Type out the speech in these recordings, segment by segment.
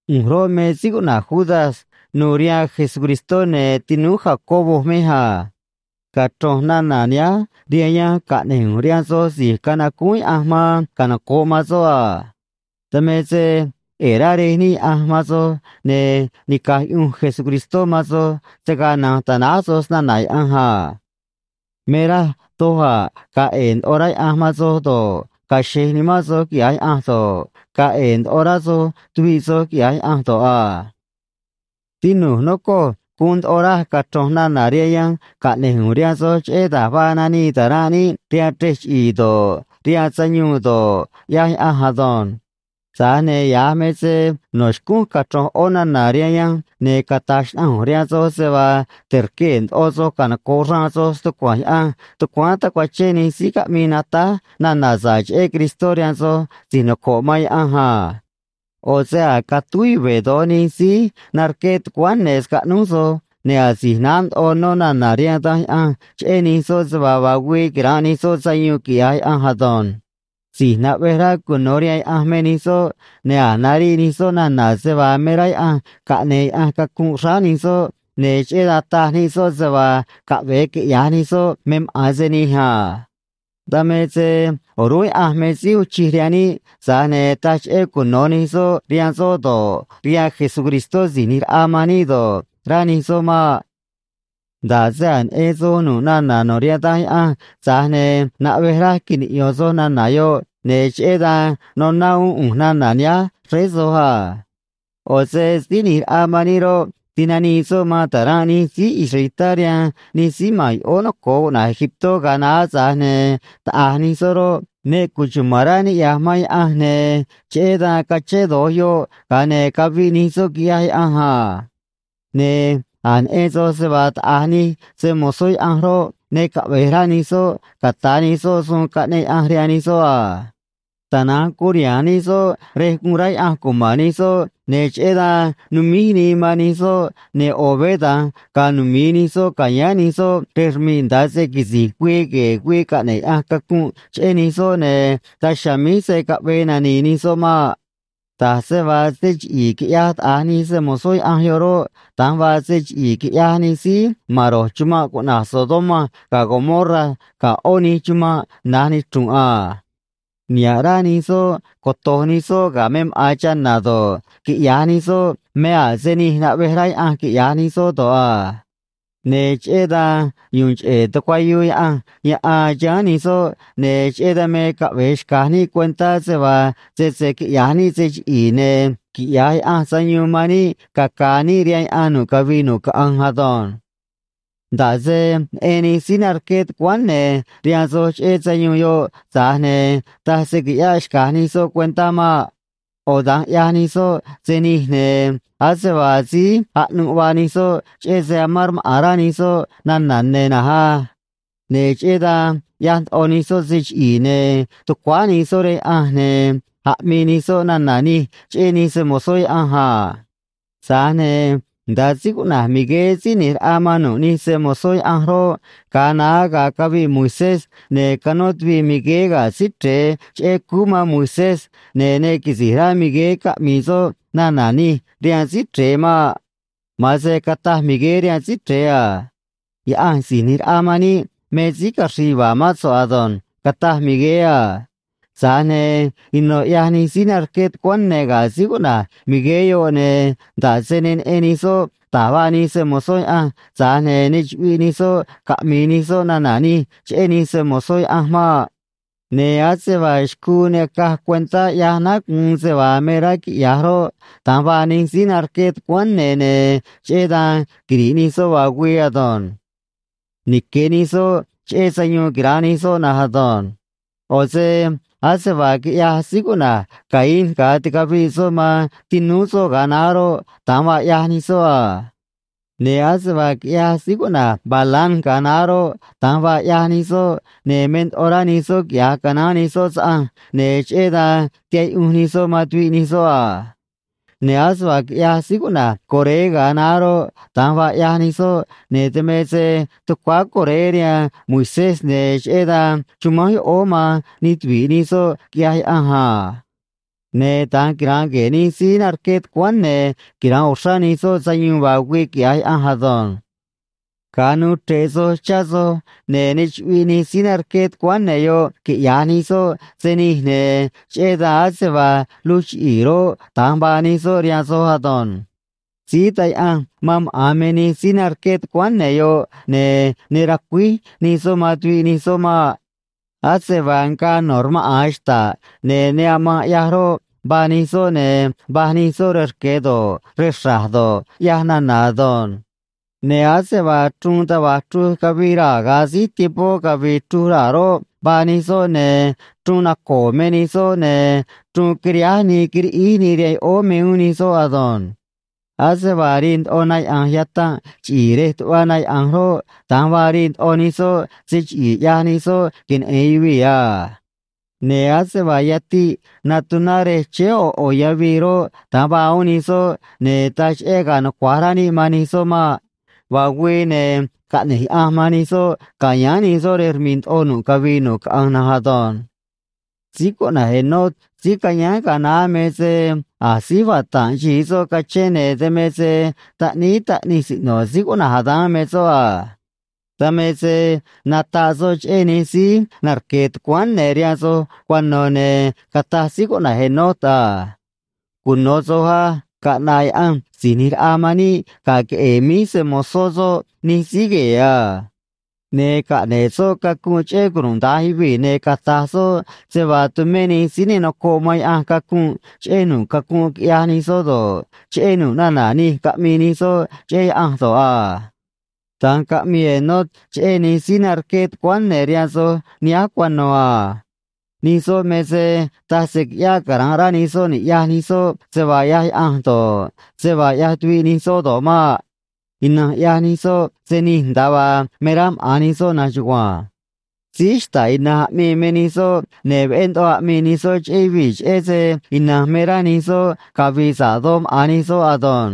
ꞌU̱nj roꞌ, me síí cuꞌna̱j Judas nu̱u̱ rihaan Jesucristó, ne̱ tinúú Jacobo mej a. Cachro̱nj nana̱ nihánj rihaan yanj caꞌne̱j ꞌu̱nj rihaan soj si̱j canacúún Yaꞌanj man canoco̱ꞌ man soꞌ a. Dan me se ꞌe̱e̱ rá Rej níꞌ Yaꞌanj man soj, ne̱ nica̱j yuꞌunj Jesucristó man soj se̱ gaa na̱nj ta̱náj soj snana̱ Yaꞌanj a. Me raj doj a̱ ga̱a̱ ꞌe̱e̱ ndoꞌo rá Yaꞌanj man soj do̱ꞌ, ga̱a̱ xe̱j nimán soj quiꞌya̱j Yaꞌanj do̱ꞌ, ga̱a̱ ꞌe̱e̱ ndoꞌo rá soj tuviꞌ soj quiꞌya̱j Yaꞌanj do̱ꞌ a. Tinu̱j, nocoj, guun ndoꞌo raj cachro̱nj nana̱ rihaan yanj caꞌne̱j ꞌu̱nj rihaan soj cheꞌé da̱j vaa nanii ta̱ranꞌ níꞌ rihaan chrej chiꞌi̱i̱ do̱ꞌ, rihaan sayuun do̱ꞌ, ꞌyaj Yaꞌanj ado̱nj. Tza̱j ne̱ ya̱j me se no̱ xcúnj cachro̱nj ꞌó nana̱ rihaan yanj, ne̱ cata̱j xnaꞌanj ꞌu̱nj rihaan soj se vaa te̱rquee̱ ndoꞌo soj canoco̱ꞌ xraan soj stucua̱nj Yaꞌanj tucuáán tacuachén nij síí caꞌmii natáj nana̱ sa̱ꞌ cheꞌé Cristó rihaan soj si̱j noco̱ꞌ man Yaꞌanj a. ꞌO̱ se a̱j catúj yuve̱ do̱j nij síí narqué tucuáán ne̱ scaꞌnúj soj, ne̱ asi̱j naá ndoꞌo nó nana̱ rihaan Danj Yaꞌanj cheꞌé nij soꞌ se vaa vaa güii quira̱nꞌ nij soꞌ sayuun, quiꞌya̱j Yaꞌanj ado̱nj. Si̱j naꞌvej rá cuno̱ rihaan Yaꞌanj me nij soꞌ, ne̱ a̱j nariꞌ nij soꞌ nana̱ se vaa me rá Yaꞌanj caꞌne̱e̱ Yaꞌanj cacunꞌ xráá nij soꞌ, ne̱ cheꞌé dan taj nij soꞌ se vaa caꞌve̱e quiꞌya̱j nij soꞌ me maꞌa̱n se nij a. Dan me se o̱rúnꞌ Yaꞌanj me síí uun chij rihaan níꞌ, tza̱j ne taj cheꞌé cuno̱ nij soꞌ rihaan soꞌ do̱ꞌ, rihaan Jesucristó Si̱j ꞌNi̱j Raꞌa man níꞌ do̱ꞌ, rá nij soꞌ maꞌ. Nda̱ꞌ se a̱j neꞌen soj nu̱ꞌ nana̱ no̱ rihaan Danj Yaꞌanj, tza̱j ne̱ naꞌvej raj quiniꞌyo̱n soj nana̱ yoꞌ, ne̱ cheꞌé dan noná uún ꞌu̱nj nana̱ nihánj xréé soj a. ꞌO̱ se Síí ꞌNi̱j Raꞌa man níꞌ roꞌ, tinanii soꞌ man ta̱ranꞌ nij síí israelitá rihaan nij síí ma̱n yoꞌóó noco̱o cuꞌna̱j Egiptó ga̱a naá, tza̱j ne̱ taꞌa̱j nij soꞌ roꞌ, ne cuchuma̱n rá ni̱ꞌyaj man Yaꞌanj, ne̱ cheꞌé dan cachén do̱j yoꞌ, ga̱a ne̱ caviꞌ nij soꞌ, quiꞌyaj Yaꞌanj a. Ne̱ a̱j neꞌen soj se vaa taꞌa̱j nij se‑mo̱zó Yaꞌanj roꞌ, ne caꞌve̱j rá nij soꞌ ca̱ta̱ nij soꞌ suun caꞌneꞌ Yaꞌanj rihaan nij soꞌ a. Tana̱nj curiha̱nj nij soꞌ rej guun rá Yaꞌanj cuma̱n nij soꞌ, ne̱ cheꞌé dan numíj nii man nij soꞌ, ne̱ ꞌo̱ veé da̱nj ga̱a̱ numi̱i nij soꞌ ca̱yáán nij soꞌ rej rmi̱ꞌ nda̱a se quisi̱j güii gue̱e̱ güii caꞌne̱ꞌ Yaꞌanj cacunꞌ cheꞌé nij soꞌ, ne̱ daj chiha̱a̱ míj se̱ caꞌvee nani̱i̱ nij soꞌ maꞌ. Da̱j se vaa se chiꞌi̱i̱ quiꞌyaj taꞌa̱j nij se‑mo̱zó Yaꞌanj yoꞌ roꞌ, da̱nj vaa se chiꞌi̱i̱ quiꞌyaj nij síí ma̱n ro̱j chumanꞌ cuꞌna̱j Sodoma ga̱ Gomorra ga̱ ꞌó nij chumanꞌ na̱j nichru̱nꞌ a. Niha̱ꞌ rá nij soꞌ coto̱j nij soꞌ ga̱ me maꞌa̱n chana̱ do̱ꞌ, quiꞌya̱j nij soꞌ me a̱ se nij naꞌvej Yaꞌanj quiꞌya̱j nij soꞌ do̱ꞌ a. Ne̱ cheꞌé dan yu̱u̱n cheꞌe̱ tucuayuu Yaꞌanj yaꞌan chiháán nij soꞌ, ne̱ cheꞌé dan me caꞌve̱e xca̱j níꞌ cuentá se vaa sese quiꞌya̱j níꞌ se chiꞌi̱i̱, ne̱ quiꞌya̱j Yaꞌanj sayuun man níꞌ caca̱a̱ níꞌ rihaan yaꞌan nu̱ꞌ cavii nu̱ꞌ caꞌanj ado̱nj. Nda̱ꞌ se neꞌen nij síí narqué tucuáán ne̱ rihaan soj cheꞌé sayuun yoꞌ, tza̱j ne̱ taj se qui̱ꞌyáꞌ xca̱j nij soꞌ cuentá maꞌ. ꞌO̱ da̱nj ꞌyaj nij soꞌ se nij, ne̱ ase vaa síí aꞌnuꞌ vaa nij soꞌ, cheꞌé se amán rmaꞌa̱n rá nij soꞌ nana̱ ne̱ na̱nj á. Ne̱ cheꞌé dan ꞌyaj ndoꞌo nij soꞌ se chiꞌi̱i̱, ne̱ tucuáá nij soꞌ rihaan Yaꞌanj, ne̱ aꞌmii nij soꞌ nana̱ nij cheꞌé nij se‑mo̱zó Yaꞌanj a. Tza̱j ne̱ nda̱a síí cuꞌna̱j Migueé síí ꞌni̱j raꞌa man nu̱ꞌ nij se‑mo̱zó Yaꞌanj roꞌ, ga̱a naá ga̱a caviꞌ Moisés ne̱ canó tuviꞌ Migueé ga̱ Síí Chre̱e cheꞌé cúú man Moisés, ne̱ ne quisi̱j rá Migueé caꞌmi̱i̱ soꞌ nana̱ nij rihaan Síí Chre̱e maꞌ. Ma̱an se cataj Migueé rihaan Síí Chre̱e a: “Yaꞌanj Si̱j ꞌNi̱j Raꞌa man níꞌ me síí caxri̱i̱ yuva̱a̱ mán so̱ꞌ ado̱nj”, cataj Migueé a. Tza̱j ne̱ ino̱ ꞌyaj nij síí narqué tucuáán ne̱ ga̱ síí cuꞌna̱j Migueé yoꞌ, ne̱ nda̱ꞌ se ne neꞌen nij soꞌ da̱j vaa nij se‑mo̱zó Yaꞌanj, tza̱j ne̱ ne chuꞌviꞌ nij soꞌ caꞌmi̱i̱ nij soꞌ nana̱ nij cheꞌé nij se‑mo̱zó Yaꞌanj maꞌ. Ne̱ ase vaa xcuu ne acaj cuentá ꞌyaj náá guun se vaa me rá quiꞌya̱j roꞌ, da̱nj vaa nij síí narqué tucuáán ne̱, ne̱ cheꞌé dan quiri̱ꞌ nij soꞌ vaa güii ado̱nj. Nique̱ nij soꞌ cheꞌé sayuun quira̱nꞌ nij soꞌ na̱nj ado̱nj. ꞌO̱ se ase vaa quiꞌyaj síí cuꞌna̱j Caín ga̱a ticaviꞌ soꞌ man tinúú soꞌ ga̱a naá roꞌ, da̱nj vaa ꞌyaj nij soꞌ a. Ne̱ ase vaa quiꞌyaj síí cuꞌna̱j Balaam ga̱a naá roꞌ, da̱nj vaa ꞌyaj nij soꞌ, ne̱ me ndoꞌo rá nij soꞌ quiꞌya̱j canaán nij soꞌ saꞌanj, ne̱ cheꞌé dan tihaꞌ yuꞌunj nij soꞌ man tuviꞌ nij soꞌ a. Ne̱ ase vaa quiꞌyaj síí cuꞌna̱j Coré ga̱a naá roꞌ, da̱nj vaa ꞌyaj nij soꞌ, ne̱ dan me se tucuáá Coré rihaan Moisés, ne̱ cheꞌé dan chumánj yoꞌóó man nij tuvi̱ꞌ nij soꞌ, quiꞌyaj Yaꞌanj a. Ne̱ da̱nj quira̱nꞌ gue̱e̱ nij síí narqué tucuáán ne̱, quira̱nꞌ uxrá nij soꞌ sayuun vaa güii, quiꞌya̱j Yaꞌanj ado̱nj. Ga̱a nuu chre̱ꞌ soj chá soj, ne̱ ne chuꞌviꞌ nij síí narqué tucuáán ne̱ yoꞌ quiꞌya̱j nij soꞌ se nij, ne̱ cheꞌé dan ase vaa luj chiꞌi̱i̱ roꞌ, da̱nj vaa nij soꞌ rihaan soj ado̱nj. Síí taj yaꞌanj man maꞌa̱n me nij síí narqué tucuáán ne̱ yoꞌ, ne̱ ne racuíj nij soꞌ man tuviꞌ nij soꞌ maꞌ. Ase vaa ngaa no̱ rmaꞌa̱n xta̱ꞌ ne̱ ne amanꞌ ꞌyaj roꞌ, vaa nij soꞌ, ne̱ va̱j nij soꞌ rej rque̱ do̱ꞌ, rej xra̱j do̱ꞌ, ꞌyaj nana̱ ado̱nj. Ne̱ ase vaa chruun taj va̱j chruj cavii raa̱ ga̱a síj tiempó cavi̱i̱ chruj raa̱ roꞌ, vaa nij soꞌ, ne̱ chruun naco̱o̱ me nij soꞌ, ne̱ chruun quiriháj nii quiriꞌíj nii rihaan yoꞌóó me uún nij soꞌ ado̱nj. Ase vaa rii ndoꞌo na yaꞌa̱nj yatanꞌ chiꞌi̱i̱ rej tuꞌva na yaꞌa̱nj roꞌ, da̱nj vaa rii ndoꞌo nij soꞌ se chiꞌi̱i̱ ꞌyaj nij soꞌ queneꞌe̱n yuvii̱ a. Ne̱ ase vaa yatiꞌ natuná rej chéé ꞌo̱ ꞌo̱ yavii roꞌ, da̱nj vaa uún nij soꞌ, ne̱ taj cheꞌé ga̱a̱ nucua̱j rá níꞌ man nij soꞌ maꞌ. Vaa güii, ne̱ caꞌne̱j Yaꞌanj man nij soꞌ ca̱yáán nij soꞌ rej rmi̱ꞌ ndoꞌo nu̱ꞌ cavii nu̱ꞌ caꞌanj na̱nj ado̱nj. Síí cuꞌna̱j Enoc síí cayáán ga̱a naá me se a̱j síj vata̱nꞌ xi̱i soꞌ cachén, ne̱ dan me se taꞌníí taꞌnij siꞌno̱ síí cuꞌna̱j Adán me soꞌ a. Dan me se nataꞌ soꞌ cheꞌé nij síí narque̱ tucuáán ne̱ rihaan soj cuano̱, ne̱ cataj síí cuꞌna̱j Enoc a: “Cuno̱ soj á. Caꞌna̱ꞌ Yaꞌanj Si̱j ꞌNi̱j Raꞌa man níꞌ ga̱ queꞌe̱e̱ míj nij se‑mo̱zó soꞌ nij síí gue̱e̱ a. Ne̱ caꞌne̱ꞌ soꞌ cacunꞌ cheꞌé cunuda̱nj yuvii̱, ne̱ cata̱j soꞌ se vaa tumé nij síí ne nocoꞌ man Yaꞌanj cacunꞌ cheꞌé nu̱ꞌ cacunꞌ quiꞌyaj nij soꞌ do̱ꞌ, cheꞌé nu̱ꞌ nana̱ nij caꞌmii nij soꞌ cheꞌé Yaꞌanj do̱ꞌ a.” Da̱nj caꞌmii Enoc cheꞌé nij síí narqué tucuáán ne̱ rihaan soj nihánj cuano̱ a. Nij soꞌ me se taj se qui̱ꞌyáꞌ cara̱nꞌ rá nij soꞌ ni̱ꞌyaj nij soꞌ se vaa ꞌyaj Yaꞌanj do̱ꞌ, se vaa ꞌyaj tuviꞌ nij soꞌ do̱ꞌ maꞌ. Ina̱nj ꞌyaj nij soꞌ se nij nda̱a vaa me rá maꞌa̱n nij soꞌ na̱nj chugua̱nj. Síí xta̱ꞌ ina̱nj aꞌmii me nij soꞌ, ne̱ veꞌé ndoꞌo aꞌmii nij soꞌ cheꞌé yuvii̱ cheꞌé se ina̱nj me rá nij soꞌ cavi̱i̱ sa̱ꞌ doj maꞌa̱n nij soꞌ ado̱nj.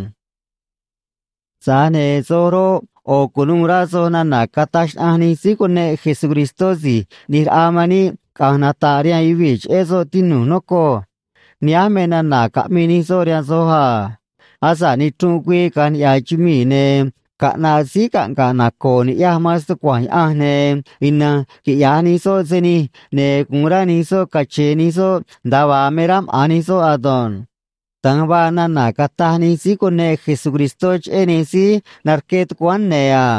Tza̱j ne̱ soj roꞌ, ꞌo̱ cu̱nuû rá soj nana̱ cataj xnaꞌanj nij síí cuneꞌ Jesucristó Si̱j ꞌNi̱j Raꞌa man níꞌ caꞌa̱nj nata̱ꞌ rihaan yuvii̱ cheꞌé soꞌ, tinu̱j, nocoj. Nihánj me nana̱ caꞌmii nij soꞌ rihaan soj a: “Asa̱ꞌ nichrunꞌ güii caꞌa̱nj niꞌya̱ chumii̱, ne̱ caꞌna̱ꞌ síí caꞌnga̱ꞌ naco̱o̱ ni̱ꞌyaj man stucua̱nj Yaꞌanj, ne̱ ina̱nj quiꞌya̱j nij soꞌ se nij, ne̱ gu̱un rá nij soꞌ cache̱e̱ nij soꞌ nda̱a vaa me rá maꞌa̱n nij soꞌ ado̱nj.” Da̱nj vaa nana̱ cataj nij síí cuneꞌ Jesucristó cheꞌé nij síí narqué tucuáán ne̱ a.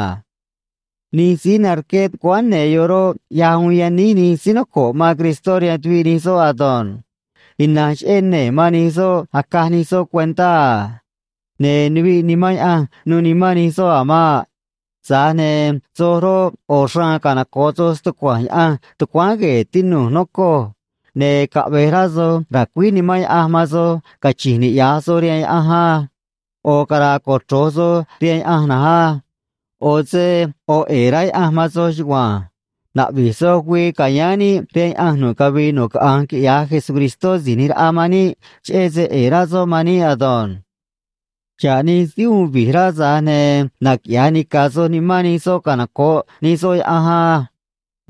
Nij síí narqué tucuáán ne̱ yoꞌ roꞌ, ꞌyaj uun yaníj nij síí noco̱ꞌ man Cristó rihaan tuviꞌ nij soꞌ ado̱nj. Ina̱nj cheꞌé nee̱ man nij soꞌ acaj nij soꞌ cuentá a. Ne̱ nuviꞌ Nimán Yaꞌanj nu̱u̱ nimán nij soꞌ a̱ maꞌ. Tza̱j ne̱ soj roꞌ, ꞌo̱ xraan canoco̱ꞌ soj stucua̱nj Yaꞌanj tucuáán gue̱e̱, tinu̱j, nocoj. Ne̱ caꞌve̱j rá soj ra̱cuíj Nimán Yaꞌanj man soj cachi̱nj niꞌya̱j soj rihaan Yaꞌanj á. ꞌO̱ cara̱a̱ cochro̱j soj rihaan Yaꞌanj na̱nj á. ꞌO̱ se ꞌo̱ ꞌe̱e̱ rá Yaꞌanj man soj chugua̱nj. Na̱ꞌvi̱j soj güii ca̱yáán níꞌ rihaan Yaꞌanj nu̱ꞌ cavii nu̱ꞌ caꞌanj quiꞌya̱j Jesucristó Si̱j ꞌNi̱j Raꞌa man níꞌ, cheꞌé se ꞌe̱e̱ rá soꞌ man níꞌ ado̱nj. Xa̱ꞌ nij síí uun vi̱j rá, tza̱j ne̱ naquiꞌya̱j nica̱ soj nimán nij soꞌ canoco̱ꞌ nij soꞌ Yaꞌanj á.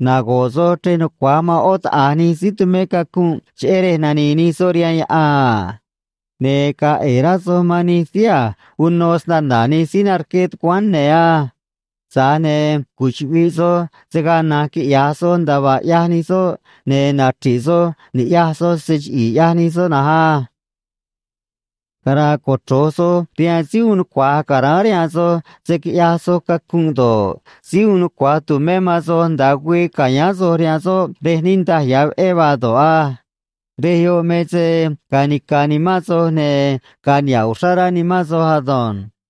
Nago̱ꞌ soj chrej nucua̱j man ꞌó taꞌa̱j nij síí tumé cacunꞌ cheꞌé rej nani̱i̱ nij soꞌ rihaan yaꞌan a. Ne̱ ga̱a̱ ꞌe̱e̱ rá soj man nij síí a̱j uno snana̱ nij síí narqué tucuáán ne̱ á. Tza̱j ne̱ cuchuꞌvi̱ꞌ soj se̱ gaa na̱nj quiꞌya̱j soj nda̱a vaa ꞌyaj nij soꞌ, ne̱ nachri̱ꞌ soj ni̱ꞌyaj soj se chiꞌi̱i̱ ꞌyaj nij soꞌ na̱nj á. Cara̱a̱ cochro̱j soj rihaan síí uun nucua̱j ca̱ráán rihaan soj se̱ quiꞌyaj soj cacunꞌ do̱ꞌ, síí uun nucua̱j tu̱mé man soj nda̱a güii ca̱yáán soj rihaan soꞌ rej niꞌndaj ya̱ veꞌé vaa do̱ꞌ á. Rej yoꞌ me se ga̱a̱ nica̱ nimán soj, ne̱ ga̱a̱ niha̱ꞌ uxrá rá nimán soj ado̱nj.